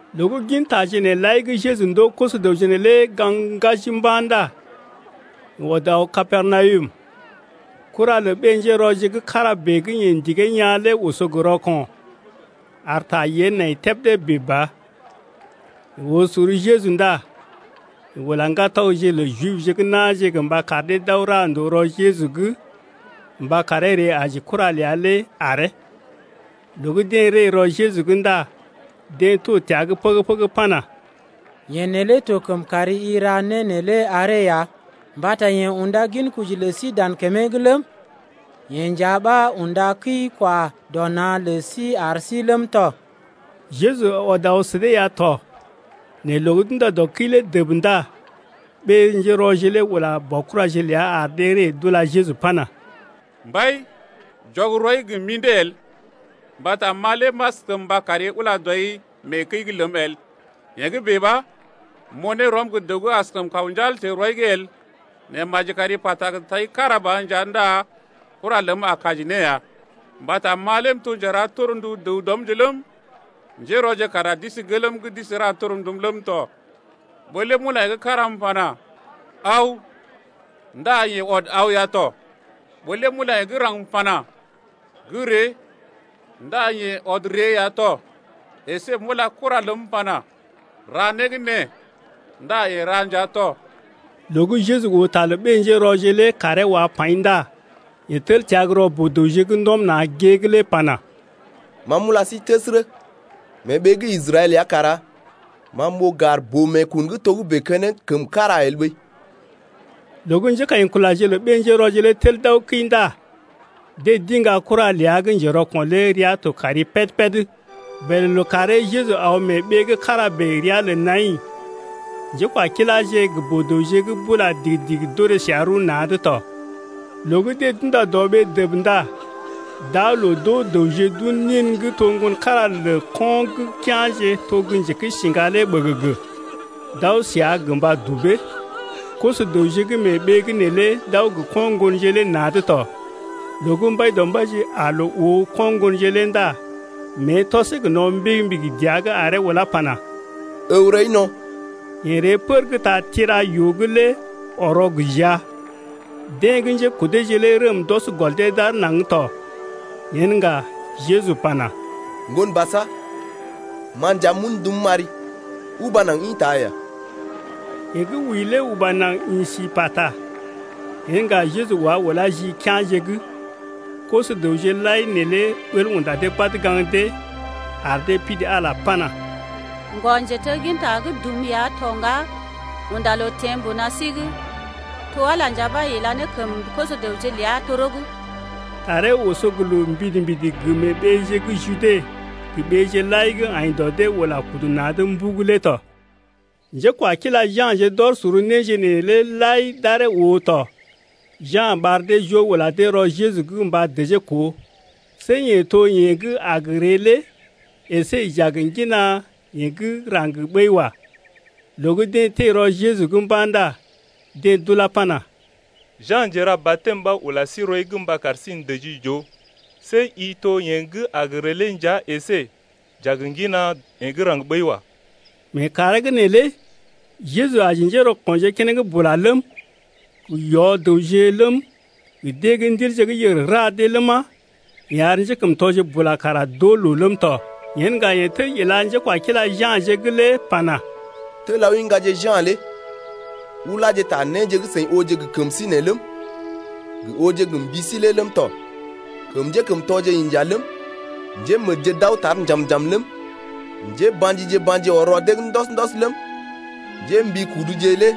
Loo gə́ gin taje nee lai gə́ Jeju ndoo koso-dəwje neelé gaŋg ŋgaji mba̰ ndá yeḛ ɔd aw Kapernawum. Kura lə ɓé-njérɔje gə́ kára bèe gə́ yeḛ ndigee yaa̰ lé oso gə rɔko̰ ar ta yée nai tebdé bèe ba. Yeḛ oo sor Jeju ndá yeḛ ula ŋgatɔgje lə Jibje gə́ na̰je gə mba kar dee d’aw ra ndòo rɔ Jeju’g mba karee ree aji kura ləa lé aree. Loo gə́ deḛ ree rɔ Jeju’g ndá deḛ to təa’g pəgə-pəgə pana: Yeḛ neelé to kəm kar i ra né neelé aree ya, mbata yeḛ unda ginkoji lə sí dan kəmee’g ləm, yeḛ nja ɓa unda kəi-kwa-dɔ-na̰ lə sí ar sí ləm tɔ. Jeju ɔd aw sə dee ya to nɛ loo gə́ d’unda dɔ kəi lé dəb ndá ɓé-njérɔje lé ula baokuraje ləa ar dee ree d’ula Jeju pana: Mbai, jɔg rɔi gə mḭdé el, mbata ma lé m’askəm mba kari ula dɔi mee kəi’g ləm el. Yee gə́ bèe ɓa m’oo ne rɔm gə́ dəw gə́ askəm kaw njal teḛ rɔi’g el. Nɛ maji kari pata gə tai kára ba nja ndá kura ləm a kaji ne ya. Mbata ma lé m’to gə́ njera torndu dəw dɔmje ləm, njérɔje kara d’isi gelm’g d’isi ra torndum ləm tɔ. Ɓó lé m’ula yeḛ gə́ kára m’pana: Aw! ndá yeḛ ɔd aw ya tɔ. Ɓó lé m’ula yeḛ gə́ raŋg m’pana: Gə́ ree! ndá yeḛ ɔd ree ya tɔ, əsé m’ula kura ləm m’pana: Ra né gə́ nee! ndá yeḛ ra nja tɔ. Loo gə́ Jeju oo ta lə ɓé-njérɔje lé kaaree wa paḭ ndá yeḛ tel təa gə́ rɔ boo-dəwje gə́ ndɔm na̰ gée’g lé pana: Ma m’ula sí təsərə, mee ɓee gə́ Israɛl ya kara ma m’oo gar boo-meekun gə́ togə́bè keneŋ kəm kára el ɓəi. Loo gə́ njékaḭkulaje lə ɓé-njérɔje lé tel d’aw kəi ndá dee d’iŋga kura ləa gə́ njerɔko̰ lé rəa to kari péd-péd. Bèlè lookàree Jeju aw mee ɓee’g kára bèe ria lə Naḭ, njékwakiláje gə boo-dəwje gə́ bula digi-digi d’orè səa rəw na̰’d tɔ. Loo gə́ deḛ d’unda dɔ ɓee dəb ndá d’aa loo d’oo dəwje d’un nin gə́ to ŋgon kára lə ko̰ gə́ kea̰je to gə́ njekəisiŋga lé ɓəgəgə, d’aw səa gə mba dubee, koso-dəwje gə́ mee ɓee’g neelé d’aw gə ko̰ ŋgonje lé na̰’d tɔ. Loo gə́ Mbaidɔmbaije aa loo oo ko̰ ŋgonje lé ndá mée tɔsee gə no̰ mbigi-mbigi dəa’g aree ulá pana: Ǝw rɔi no̰! Yeḛ ree pər gə́ ta tira-yoo’g lé ɔrɔ gə jia. Deḛ gə́ njékodeje lé rəm d’ɔs gɔl dee d’aar naŋg tɔ. Yen ŋga, Jeju pana: Ŋgon basa, ma nja m’un ndum m’ari, uba naŋg ḭta ya! Yeḛ gə́ wəi lé uba naŋg ḭ si pata. Yen ŋga Jeju wá ulá ji kea̰je’g. Koso-dəwje lai neelé ɓəl unda dee badə gaŋg dee ar dee pidi Ala pana: Ŋgɔ-njetegginta gə́ dum ya to ŋga, unda loo teḛ mbuna sí’g. To Ala nja ɓa ila ne kəm koso-dəwje ləa toro’g. Taree oso gə loo mbidi-mbidi gə mee ɓeeje gə́ Jude gə ɓeeje lai gə́ aḭ dɔ dee ula kudu naŋg mbugu lé tɔ. Njékwakila Ja̰je d’ɔr sor néje neelé lai d’aree oo tɔ. Ja̰ ɓar dee joo ula dee rɔ Jeju’g mba dəjee koo, see yeḛ to yeḛ gə́ a gə ree lé əsé j’a gə ŋgina yeḛ gə́ raŋg ɓəi wa. Loo gə́ deḛ teḛ rɔ Jeju’g mba̰ ndá deḛ d’ulá pana: Ja̰ Njera-batɛm ɓa ula sí rɔi’g mba kar sí n’dəjii j’oo see i to yeḛ gə́ a gə ree lé nja əsé j’a gə ŋgina yeḛ gə́ raŋg ɓəi wa. Mee kàree’g neelé Jeju aji njérɔko̰je keneŋ bula ləm, gə yɔ-dəwje ləm, gə deḛ gə́ ndilje gə́ yèr ra dee ləma, yeḛ ar njékəmtɔje bula kara d’oo loo ləm tɔ. Yen ŋga yeḛ tel ila njékwakila Ja̰je’g lé pana: Tel aw iŋgaje Ja̰ lé uláje ta néje gə́ seḭ ooje gə kəm sí nee ləm, gə ooje gə mbi sí lé ləm tɔ: Kəm njékəmtɔje inja ləm, njémədje d’aw tar njam-njam ləm, njéba̰jije ba̰ji ɔr rɔ dee’g ndɔs-ndɔs ləm, njémbikuduje lé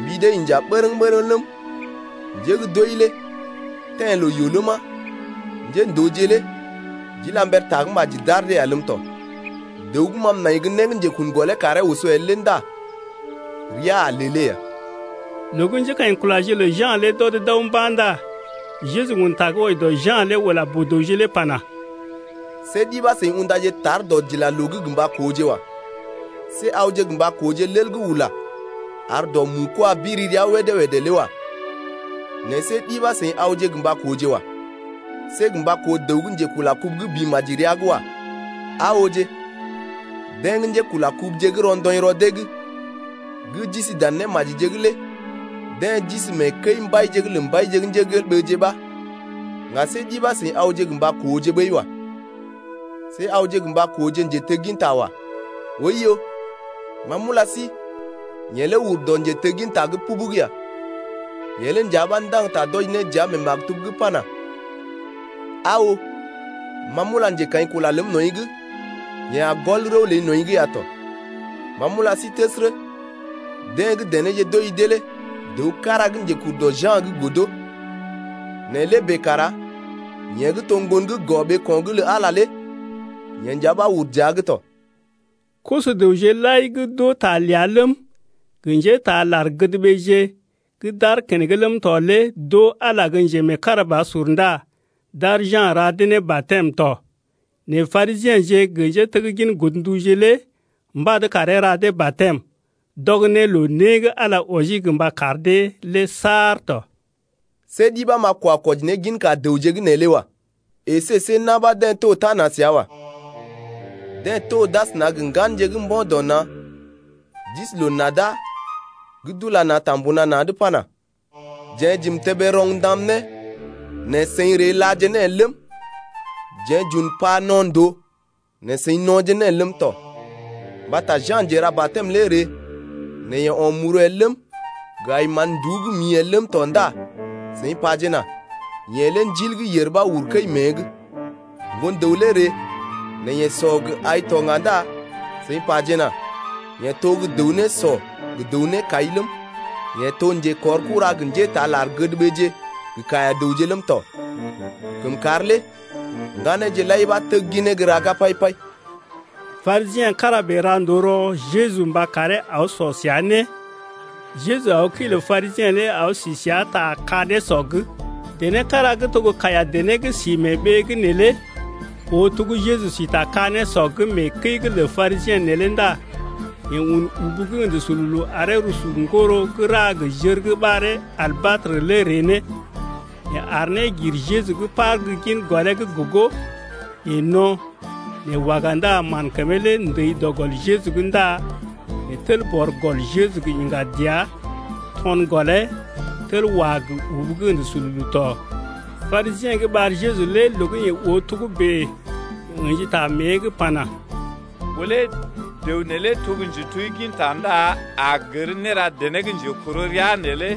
mbi dee inja bərəŋ-bərəŋ ləm, njé gə́ d’wəi lé teḛ loo-yoo’g ləma, njéndooje lé d’ila mber tagə́maji d’ar dee ya ləm tɔ. Dəw gə́ ma m’nai gə́ né gə́ njekun gɔlee karee oso el lé ndá rəa a lelee ya. Loo gə́ njékaḭkulaje lə Ja̰ lé d’ɔd d’aw mba̰ ndá Jeju un ta gə́ wɔji dɔ Ja̰ lé ula boo-dəwje lé pana: See ɗi ɓa seḭ undaje tar gə dɔdilaloo’g gə mba kooje wa. See awje gə mba kooje lel gə́ ula ar dɔ mu-kwaa biri rəa wédé-wédé lé wa. Nɛ see ɗi ɓa seḭ awje gə mba kooje wa. See gə mba koo dəw gə́ njekula kubu gə́ bḭ maji rəa’g wa. Aa ooje, deḛ gə́ njekula kubuje gə́ rɔndɔḭ rɔ dee’g gə́ d’isi dan némajije’g lé deḛ to mee kəi-mbaije’g lə mbaije ɓa. Ŋga see ɗi ɓa seḭ awje gə mba kooje ɓəi wa. See awje gə mba kooje njetegginta wa. Oiyo, ma m’ula sí, yeḛ lé ur dɔ njetegginta’g pubug ya. Yeḛ lé nja ɓa ndaŋg ta d’wɔji ne dəa mee maktub’g pana: Aa oo, ma m’ula njekaḭkula ləm nɔḭ’g, Yeḛ a gɔl rəw ləi nɔḭ’g ya tɔ. Ma m’ula sí təsərə, deḛ gə́ denéje d’oji dee lé dəw kára gə́ njekur dɔ Ja̰’g lé godo. Nɛ lé bèe kara yeḛ gə́ to gə́ ŋgon gə́ gɔ ɓeeko̰’g lə Ala lé yeḛ nja ɓa ur dəa’g tɔ. Koso-dəwje lai gə́ d’oo ta ləa ləm, gə njétaa lar-gədɓeeje gə́ d’aar keneŋ ləm tɔ lé d’oo Ala lé gə́ njemeekarabasur ndá d’ar Ja̰ ra dee ne batɛm tɔ. Nɛ Parisiḛje gə njéteggin godnduje lé mbad karee ra dee batɛm, d’ɔg ne loo né gə́ Ala wɔji gə mba kar dee lé saar tɔ. See ɗi ɓa m’a kwa kwɔji ne ginka dəwje gə́ nee lé wa. Esé see na̰ ɓa deḛ to tana səa wa. Deḛ to d’asəna gə ŋganje gə́ mbo̰ dɔ na̰ d’isi loo-nada gə́ d’ula na̰ ta mbuna na̰’d pana: Jeḛ j’im tébé roŋ ndam ne nɛ seḭ ree làje ne el ləm, jeḛ j’un pa no̰ ndòo nɛ seḭ no̰je ne el ləm tɔ. Mbata Ja̰ Njera-batɛm lé ree, nɛ yeḛ o̰ muru el ləm, gə aḭ mán-nduú gə́ mḭ el ləm tɔ ndá seḭ pajena: Yeḛ lé ndil gə́ yèr uru kəi mée’g. Ŋgon-dəw lé ree nɛ yeḛ sɔ gə ai to ŋga ndá seḭ pajena: Yeḛ to gə́ dəw nésɔ gə dəw nékai ləm, yeḛ to njekɔrkura gə njétaa lar-gədɓeeje gə kaiya-dəwje ləm tɔ. Kəmkàr lé ŋganeeje lai ɓa tegginee gə́ raga pai-pai. Parisiḛ kára bèe ra ndòo rɔ Jeju mba karee aw sɔ səa né. Jeju aw kəi lə Parisiḛ lé aw si səa ta ka-nésɔ’g. Dené kára gə́ to gə́ kaiya-dené gə́ si mee ɓee’g neelé oo to gə́ Jeju si ta ka-nésɔ’g mee kəi’g lə Parisiḛ neelé ndá yeḛ un ubu gə́ ə̰də sululu aree rusu ŋgoro gə́ ra gə jər gə́ ɓaree albatrə lé ree ne, yeḛ aar ne gir Jeju’g par gə́ gin gɔlee’g gogo. Yeḛ no̰, nɛ waga ndá mán kəmee lé ndəi dɔ gɔl Jeju’g ndá yeḛ tel bɔr gɔl Jeju lé gə́ yiŋga dəa, to̰ gɔlee, tel wá gə ubu gə́ ə̰də sululu tɔ. Parisiḛ gə́ ɓar Jeju lé loo gə́ yeḛ oo togə́bè yeḛ ə̰ji ta mée’g pana: Ɓó lé dəw neelé to gə́ njetegginta ndá a gər néra dené gə́ njekɔrɔ rəa neelé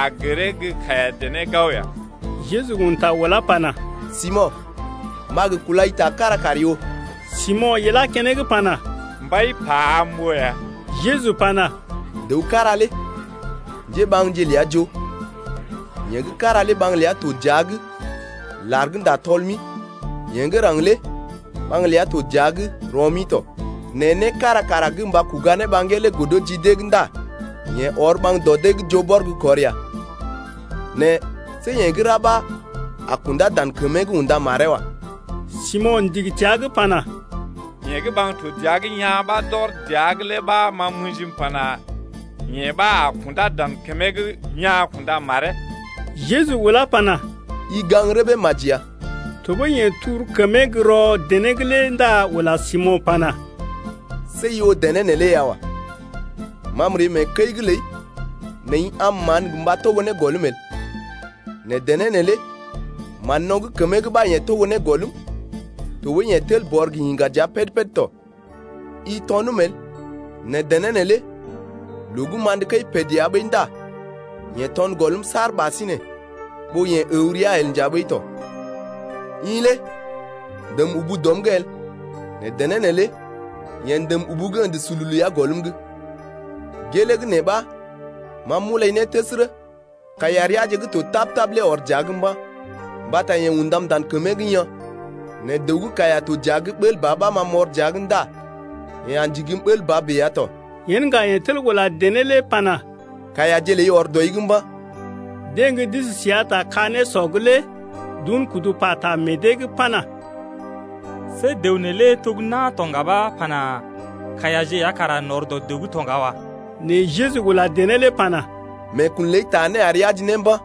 a gəree gə́ kaiya-dené gao ya. Jeju un ta ulá pana: Simo̰, m’a gə kulai ta kára kari oo. Simo̰ ilá keneŋ pana: Mbai, pa am m’oo ya. Jeju pana: Dəw kára lé njéɓaŋje ləa joo, yeḛ gə́ kára lé ɓaŋg ləa to dəa’g lar gə́ ndá tɔl-mi, yeḛ gə́ raŋg lé ɓaŋg ləa to dəa’g rɔ-mi tɔ. Nɛ né kára kara gə mba kuga ne ɓaŋgee lé godo ji dee’g ndá yeḛ ɔr ɓaŋg dɔ dee’g joo bɔr gə́ kɔr ya. Nɛ see yeḛ gə́ ra ɓa a kundá dan kəmee’g unda maree wa. Simo̰ ndigi təa’g pana: Yeḛ gə́ ɓaŋg to dəa’g yaa̰ ɓa d’ɔr dəa’g lé ɓa ma m’ə̰ji m’pana: Yeḛ ɓa a kundá dan kəmee’g yaa̰ kunda maree. Jeju ulá pana: I gaŋg rəbee maji ya. Tɔɓəi yeḛ tur kəmee gə́ rɔ dené’g lé ndá ula Simo̰ pana, see i oo dené neelé ya wa. Ma m’ree mee kəi’g ləi nɛ i am mán gə mba togo ne gɔlm el, nɛ dené neelé mán-no̰ gə́ kəmee’g ɓa yeḛ togo ne gɔlm, tɔɓəi yeḛ tel bɔr gə yiŋga dəa péd-péd tɔ. I tɔnəm el, nɛ dené neelé loo gə́ m’andə kəi pət ya ɓəi ndá yeḛ to̰ gɔlm saar ɓasinè ɓó yeḛ əw rəa el nja ɓəi tɔ. I lé ndèm ubu dɔm’g el nɛ dené neelé yeḛ ndèm ubu gə́ ə̰də sululu ya gɔlm’g. Gelee gə́ nee ɓa ma m’ulai ne təsərə, kaiya reaje gə́ to tap-tap lé ɔr dəa’g mba̰, mbata yeḛ undam dan kəmee’g yaa̰. Nɛ dəw gə́ kaiya dɔ dəa’g bəl ba ɓa ma m’ɔr dəa’g ndá yeḛ a ndigim bəl ba bèe ya tɔ. Yen ŋga yeḛ tel ula dené lé pana: Kaiyaje ləi ɔr dɔi’g mba̰. Deḛ gə́ d’isi səa ta ka-nésɔ’g lé d’un kudu pata meḛ dee’g pana: See dəw neelé to gə́ na̰ to ŋga ɓa pana: Kaiyaje ya kara n’ɔr dɔ dəw’g to ŋga wa. Nɛ Jeju ula dené lé pana: Meekun ləi taa né ari aji ne mba̰,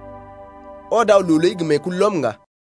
ɔd aw loo ləi gə meekulɔm ŋga.